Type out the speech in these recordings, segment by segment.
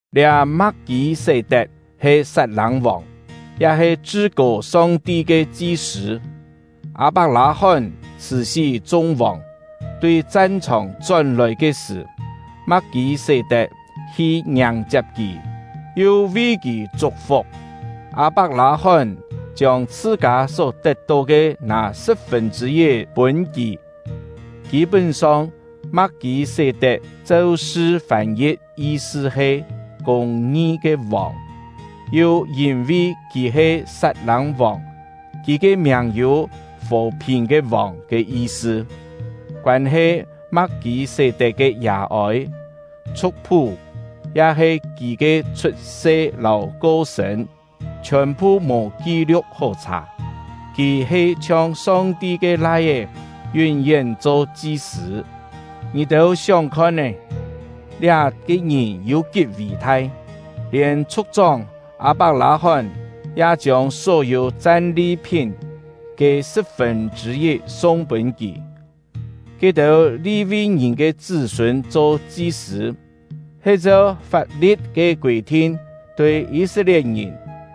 Liá Ma̍k-kî-sé-tet he Sat-lâng-vòng, ya he Chṳ-kô Song-ti ke chi-sṳ̂. Â-pak-lâ-hón chhṳ̀-sí chung vòng, tui chan-chhòng chón-lòi ke sṳ̀, Ma̍k-kî-sé-tet hi ngiàng-chiap kì, yu vi kì chuk-fuk. Â-pak-lâ-hón chiông chhṳ-kâ só tet-tó ke nâ sṳ̍p-fûn chṳ̂-yit pûn kì. Kî-pún-song, Ma̍k-kî-sé-tet cheu sṳ fân-yi̍t yi-sṳ he “Kûng-ngi ke Vòng”; yu yîn-vi kì he Sat-lâng-vòng, kì ke miàng yû “Fò-phìn “Fò-phìn” ya-he yi̍t-cho “Phìn-ôn”. ke Vòng” ke yi-sṳ. Koân-he Ma̍k-kî-sé-tet ke yà-ôi, chhu̍k-phú, ya-he kì ke chhut-se lâu ko-sṳ̂n, chhiòn-phu mò ki-liu̍k hó chhà; kì he chhiong Song-ti ke Lai-é, yún-yén cho chi-sṳ̂. Ngì-têu sióng khon-é, liá-ke ngìn yû kí ví-thai! Lièn chhu̍k-chóng Â-pak-lâ-hón ya chiông só-yû chan-li-phín ke sṳ̍p-fûn chṳ̂-yit sung pûn kì. Ke-têu Li-vi ke chṳ́-sûn cho chi-sṳ̂, he cheu fap-li̍t ke kûi-thin tui Yî-set-lie̍t-ngìn,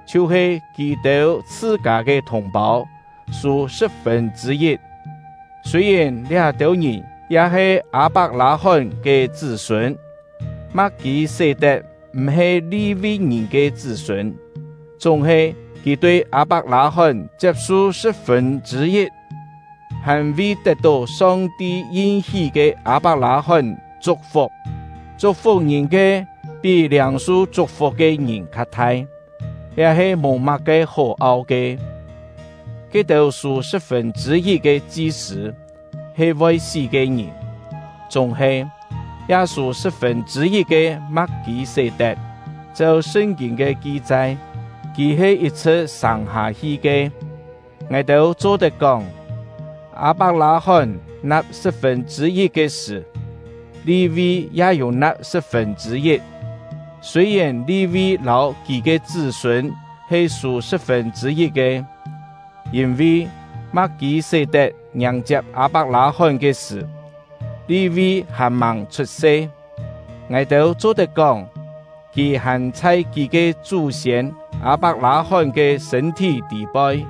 chhiu-he kì-têu chhṳ-kâ ke thùng-pâu, sû sṳ̍p-fûn chṳ̂-yit, sûi-yèn liá-têu ngìn ya he Â-pak-lâ-hón ke chṳ́-sûn. Ma̍k-kî-sé-tet m̀-he Li-vi ke chṳ́-sûn, chúng-he kì tui Â-pak-lâ-hón chiap-su sṳ̍p-fûn chṳ̂-yit, hàn vi tet-tó Song-ti yin-hí ke Â-pak-lâ-hón chuk-fuk. Chuk-fuk ngìn ke pí liâng-su chuk-fuk ke ngìn kha-thai, liá he mò má-ke hó au ke. Ke-têu sû sṳ̍p-fûn chṳ̂-yit ke chi-sṳ̂, he voi sí ke ngìn; chúng-he, ya sû sṳ̍p-fûn chṳ̂-yit ke Ma̍k-kî-sé-tet, cheu Sṳn-kîn ke ki-chai, kì he yit-chhṳ̍t sâng-hâ-hi ke. Ngài-têu cho-tet kóng, Â-pak-lâ-hón na̍p sṳ̍p-fûn chṳ̂-yit ke sṳ̀, Li-vi ya yû na̍p sṳ̍p-fûn chṳ̂-yit; sûi-yèn Li-vi lâu kì ke chṳ́-sûn he sû sṳ̍p-fûn chṳ̂-yit ke. Yîn-vi, Ma̍k-kî-sé-tet ngiàng-chiap Â-pak-lâ-hón ke sṳ̀, Li-vi hàn-màng chhut-se; ngài-têu cho-tet kóng, kì hàn chhai kì ke chú-siên Â-pak-lâ-hón ke sṳ̂n-thí tî-poi.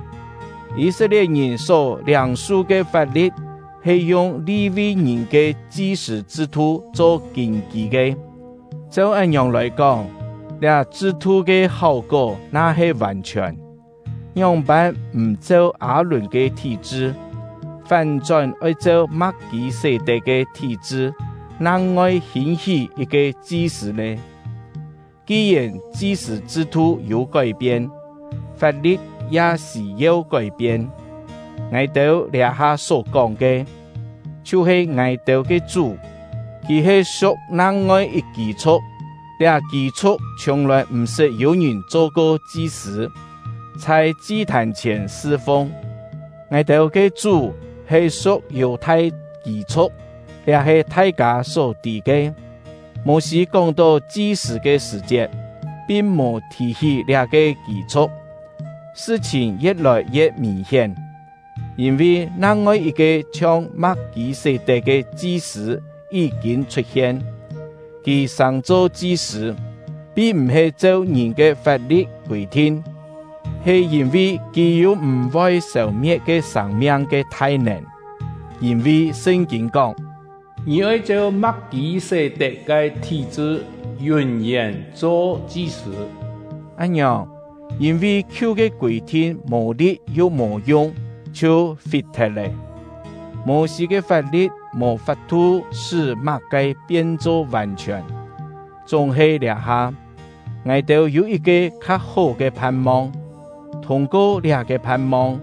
Yî-set-lie̍t-ngìn só liâng-su ke fap-li̍t he yung Li-vi-ngìn ke chi-sṳ̂ chṳ-thu cho kîn-kî ke. Cheu án-ngiòng lòi kóng, liá chṳ-thu ke háu-kó na-he vàn-chhiòn, ngióng-pân m̀ cheu Â-lùn ke thí-chṳ, fán-chón oi cheu Ma̍k-kî-sé-tet ke thí-chṳ nang-ngoi hîn-hí yit-ke chi-sṳ̂ nè? Ki-yèn chi-sṳ̂ chṳ-thu yû kói-pien, fap-li̍t ya sî-yeu kói-pien. Ngài-têu liá-ha só-kóng ke, chhiu-he ngài-têu ke Chú; kì he su̍k nang-ngoi yit kî-chhu̍k; liá kî-chhu̍k chhiùng-lòi m̀-sṳt yû ngìn cho-ko chi-sṳ̂, chhai chi-thàn chhièn sṳ-fung. Ngài-têu ke Chú he su̍k Yù-thai kî-chhu̍k, liá he thai-kâ só tî ke; Mô-sî kóng-tó chi-sṳ̂ ke sṳ̀-chiet, pin mò thì-hí liá-ke kî-chhu̍k. Sṳ-chhìn ye̍t-lòi ye̍t mìn-hién, yîn-vi nang-ngoi yit-ke chhiong Ma̍k-kî-sé-tet ke chi-sṳ̂ yí-kîn chhut-hien. Kì sàng-cho chi-sṳ̂, pin m̀-he cheu ngìn ke fap-li̍t kûi-thin, he yîn-vi kì yû m̀-voi sêu-me̍t ke sâng-miang ke thai-nèn. Yîn-vi Sṳn-kîn kóng: “Ngì oi cheu Ma̍k-kî-sé-tet ke thí-chṳ yún-yén cho chi-sṳ̂.” Án-ngiòng, yîn-vi khiu ke kûi-thin mò li̍t yu mò yung, chhiu fi-thet lé. Mô-sî ke fap-li̍t mò fap-thu sṳ́ má-ke pien-cho vàn-chhiòn; chúng-he liá-ha, ngài-têu yû yit-ke kha-hó ke phan-mong, thûng-ko liá-ke phan-mong,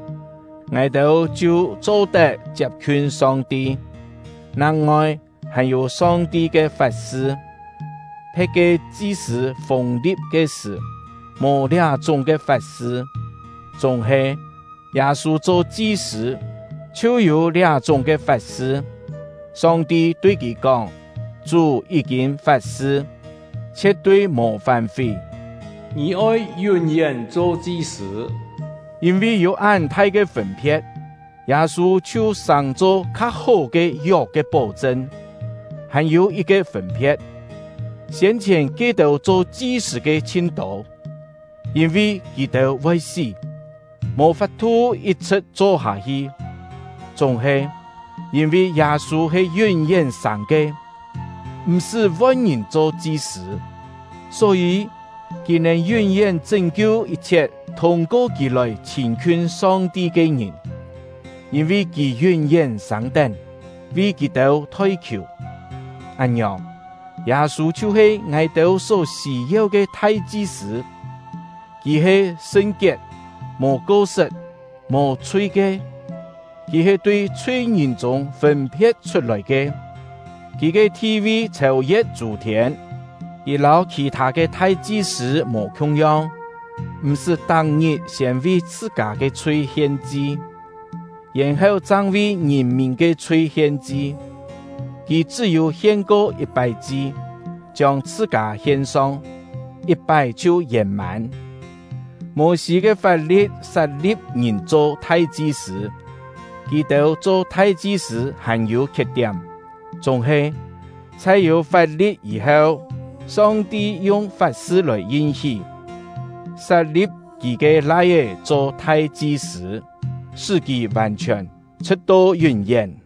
ngài-têu chhiu cho-tet chiap-khiun Song-ti. Nang-ngoi, hàn-yû Song-ti ke fat-sṳ. Phe̍t ke chi-sṳ̂ fûng-li̍p ke sṳ̀, mò liá-chúng ke fat-sṳ; chúng-he, Yâ-sû cho chi-sṳ̂ chhiu yû liá-chúng ke fat-sṳ; Song-ti tui kì kóng: Chú yí-kîn fat-sṳ, chhie̍t-tui mò fán-fí: “Ngì oi yún-yén cho chi-sṳ̂.” Yîn-vi yû án thai ke fûn-phe̍t, Yâ-sû chhiu sàng-cho kha-hó ke yok ke pó-chṳn. Hàn-yû yit-ke fûn-phe̍t: Siên-chhièn ke-têu cho chi-sṳ̂ ke chhin tô, yîn-vi kì-têu voi sí, mò fap-thu yit-chhṳ̍t cho-hâ-hi; chúng-he, yîn-vi Yâ-sû he yún-yén sâng ke, m̀-sṳ́ von-ngìn cho chi-sṳ̂. Só-yî, kì nèn yún-yén chṳ́n-kiu yit-chhiet thûng-ko kì lòi chhîn-khiun Song-ti ke ngìn; yîn-vi kì yún-yén sâng-tén, vi kì-têu thoi-khiù. Án-ngiòng, Yâ-sû chhiu-he ngài-têu só sî-yeu ke thai-chi-sṳ̂. Kì he sṳn-kiet, mò ko-sṳt, mò-chhui ke; kì he tui chhui-ngìn chûng fûn-phe̍t chhut-lòi ke; kì ke thi-vi chhêu-ye̍t chû-thiên. Kì lâu khì-thâ ke thai-chi-sṳ̂ mò khiung-yong, m̀-sṳ́ tak-ngit siên vi chhṳ-kâ ke chhui hien-chi, yèn-heu chang vi ngìn-mìn ke chhui hien-chi. Kì chṳ́-yû hien-ko yit-pái chi, chiông chhṳ-kâ hien-song, yit-pái chhiu yèn-mân. Mô-sî ke fap-li̍t sat-li̍p ngìn cho thai-chi-sṳ̂, kì-têu cho thai-chi-sṳ̂ hàn yû khiet-tiám; chúng-he, chhai yû fap-li̍t yî-heu, Song-ti yung fat-sṳ lòi yin-hí, sat-li̍p Kì ke Lai-é cho thai-chi-sṳ̂, sṳ́ kì vàn-chhiòn, chhṳ̍t-to yún-yén.